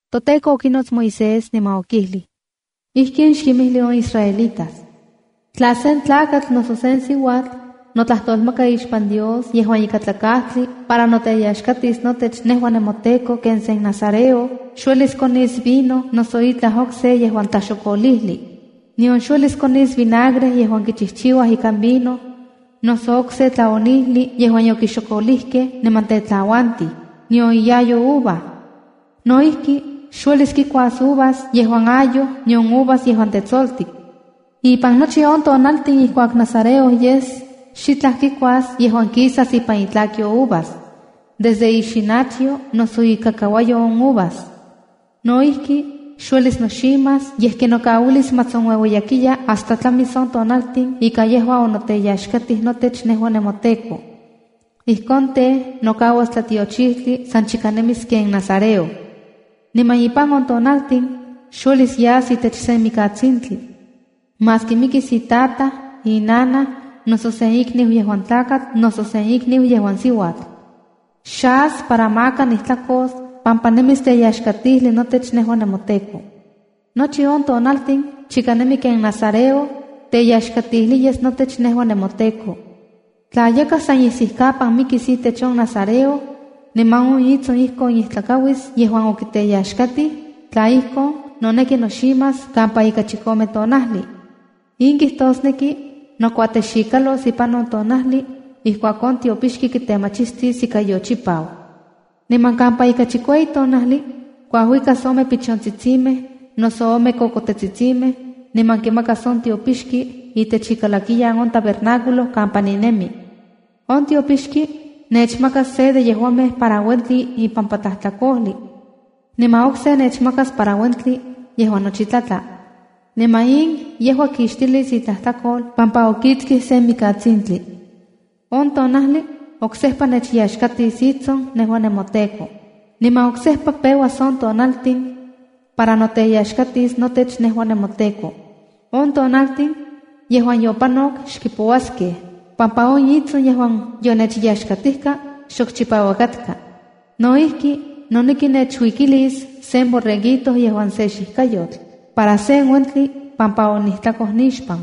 ToTEKO okinots Moisés niman okijlij: “Ijkin xkinmijli on israelitas: Tla sen tlakatl noso sen siuatl notlajtolmaka ixpan Dios yejuan ikatlakajtli para noteyaxkatis notech nejua nemoTEKO ken sen nazareo, xuelis konis vino noso itlaj okse yejuan tlaxokolijli. Nion xuelis konis vinagre yejuan kichijchiuaj ikan vino, noso okse tlaonijli yejuan yokixokolijkej niman tetlauantij, nion iyayo uva. No ijki, xuelis kikuas uvas yejuan ayoj nion uvas yejuan tetsoltik. Ipan nochi on tonaltin ijkuak nazareo yes, xitlaj kikuas yejuan kisas ipan itlakyo uvas, desde ixinachyo noso ikakauayo on uvas. No ijki, xuelis noximas, yej kinokauilis ma tsonueueyakiya, hasta tlamis on tonaltin ika yejua onoteyaxkatij notech nejua nemoTEKO. Ijkon tej, nokauas tlatiochijtli san chika nemis ken nazareo. Niman ipan on tonaltin, xuelis yas itech sen mikatsintli, maski mikis itataj, inanaj, noso sen ikniu yejuan tlakatl, noso sen ikniu yejuan siuatl. Xas para maka nijtlakos, pampa nemis teyaxkatijli notech nejua nemoTEKO. Nochi on tonaltin chika nemi ken nazareo, tlayaxkatijli yes notech nejua nemoTEKO. ’Tla yakaj san isijkapan mikis itech on nazareo, niman on itson ijkon ijtlakauis yejuan okiteyaxkatij, tla ijkon, noneki noximas kampa ika chikome tonajli. In kijtosneki, nokuatexikalos ipan on tonajli ijkuak on tiopixki kitemachistis ika yochipau. Niman kampa ika chikueyi tonajli, kuajuikas ome pichontsitsimej, noso ome kokotetsitsimej, niman kimakas on tiopixki itech ikalakiyan on tabernáculo kampa ninemi. On tiopixki nechmakas se de yejuamej para uentli ipampa tlajtlakojli, niman okse nechmakas para uentli yejuan nochi tlatla. Niman in yejua kixtilis itlajtlakol pampa okiktsij sen mikatsintli. On tonajli oksejpa nechyaxkatis itson nejua nemoTEKO. Niman oksejpa peuas on tonaltin para noteyaxkatis notech nejua nemoTEKO. On tonaltin yejuan yopanok, xkipouaskej pampa on itson yejuan yonechyaxkatijka xok chipauak katka. No ijki, noneki nechuikilis sen borreguito yejuan se xijkayotl, para sen uentli pampa onijtlakoj nixpan.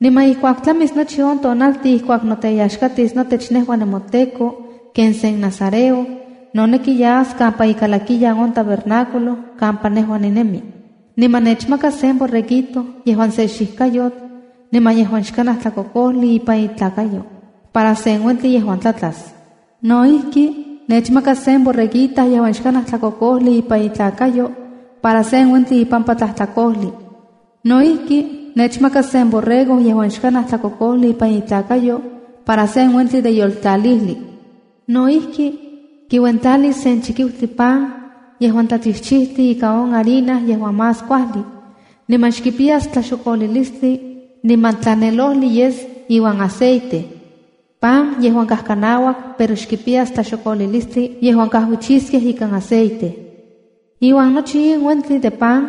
’Niman ijkuak tlamis nochi on tonaltin ijkuak noteyaxkatis notech nejua nemoTEKO ken se nazareo, noneki yas kampa ikalakiyan on tabernáculo kampa nejua ninemi. Niman nechmakas sen borreguito yejuan se xijkayotl niman yejuan xkanaj tlakokojli ipan itlakayo para sen uentli yejuan tlatlas. No ijki, nechmakas se borreguita yejuan xkanaj tlakokojli ipan itlakayo para sen uentli ipampa tlajtlakojli. No ijki, nechmakas sen borrego yejuan xkanaj tlakokojli ipan itlakayo para sen uentli de yoltlalijli. No ijki, kiuentlalis se chikiutli pan yejuan tlachichijtli ika on harina yejuan más kuajli, niman xkipiyas tlaxokolilistli niman tlanelojli yes iuan aceite, pan yejuan kajkanauak pero xkipiyas tlaxokolilistli yejuan kajuichiskej ikan aceite. Iuan nochi in uentli de pan,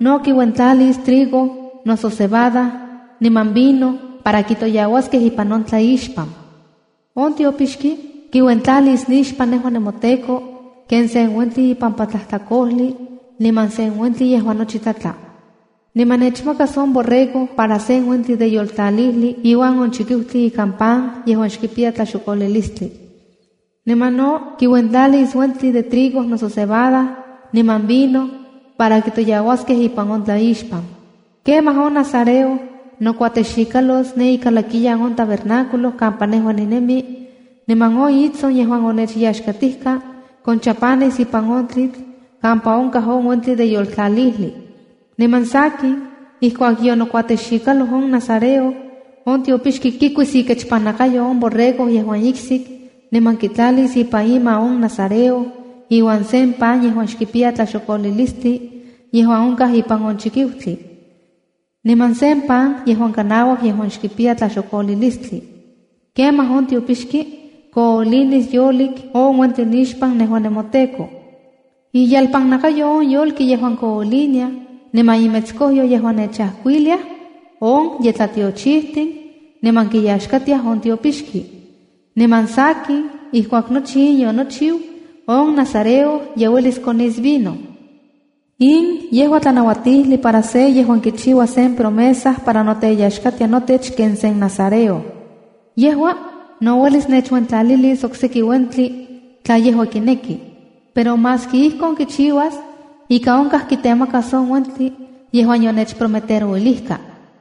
no kiuentlalis trigo noso cebada, niman vino para kitoyauaskej ipan on tlaixpan. ’On tiopixki kiuentlalis nixpan nejua nemoTEKO ken sen uentli ipampa tlajtlakojli niman sen uentli yejuan nochi tlatla. Niman nechmakas on borrego para sen uentli de yoltlalijli iuan on chikiutli ikan pan yejuan xkipiya tlaxokolilistli. Niman no kiuentlalis uentli de trigo noso cebada niman vino para kitoyauaskej ipan on tlaixpan. ’Kemaj on nazareo nokuatexikalos ne ikalakiyan on tabernáculo kampa nejua ninemi, niman on itson yejuan onechyaxkatijka konchapanis ipan on tlitl kampa onkaj on uentli de yoltlalijli. ’Niman sakin, ijkuak yonokuatexikaloj on nazareo, on tiopixki kikuis ikechpannakayo on borrego yejuan iksik niman kitlalis ipan ima on nazareo iuan sen pan yejuan xkipiya tlaxokolilistli yejuan onkaj ipan on chikiutli, niman sen pan yejuan kanauak yejuan xkipiya tlaxokolilistli. Kemaj on tiopixki koolinis yolik on uentli nixpan nejua nemoTEKO. Iyelpannakayo on yolki yejuan kooliniaj, niman imetskojyo yejuan nechajkuilia, on ye tlatiochijtin niman kiyaxkatiaj on tiopixki. Niman sakin, ijkuak nochi in yonochiu, on nazareo ye uelis konis vino. ’In yejua tlanauatijli para se yejuan kichiua sen promesa para noteyaxkatia notech ken sen nazareo. Yejua no uelis nechuentlalilis okseki uentli tla yejua kineki. Pero maski ijkon kichiuas, ika onkaj kintemakas on uentin yejuan yonechprometerouilijka.”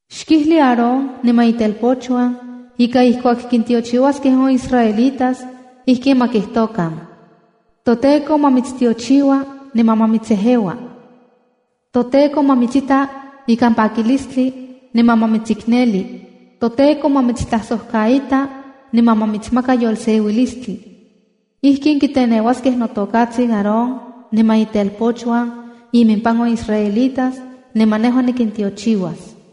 “Xkijli Aarón niman itelpochuan ika ijkuak kintiochiuaskej on israelitas, ijkin ma kijtokan: ToTEKO ma mitstiochiua niman ma mitsejeua. ToTEKO ma mitsita ikan pakilistli, niman ma mitsikneli. ToTEKO ma mitstlajsojkaita niman ma mitsmaka yolseuilistli. ’Ijkin kiteneuaskej notokatsin Aarón niman itelpochuan imimpan on israelitas, niman nejua nikintiochiuas.”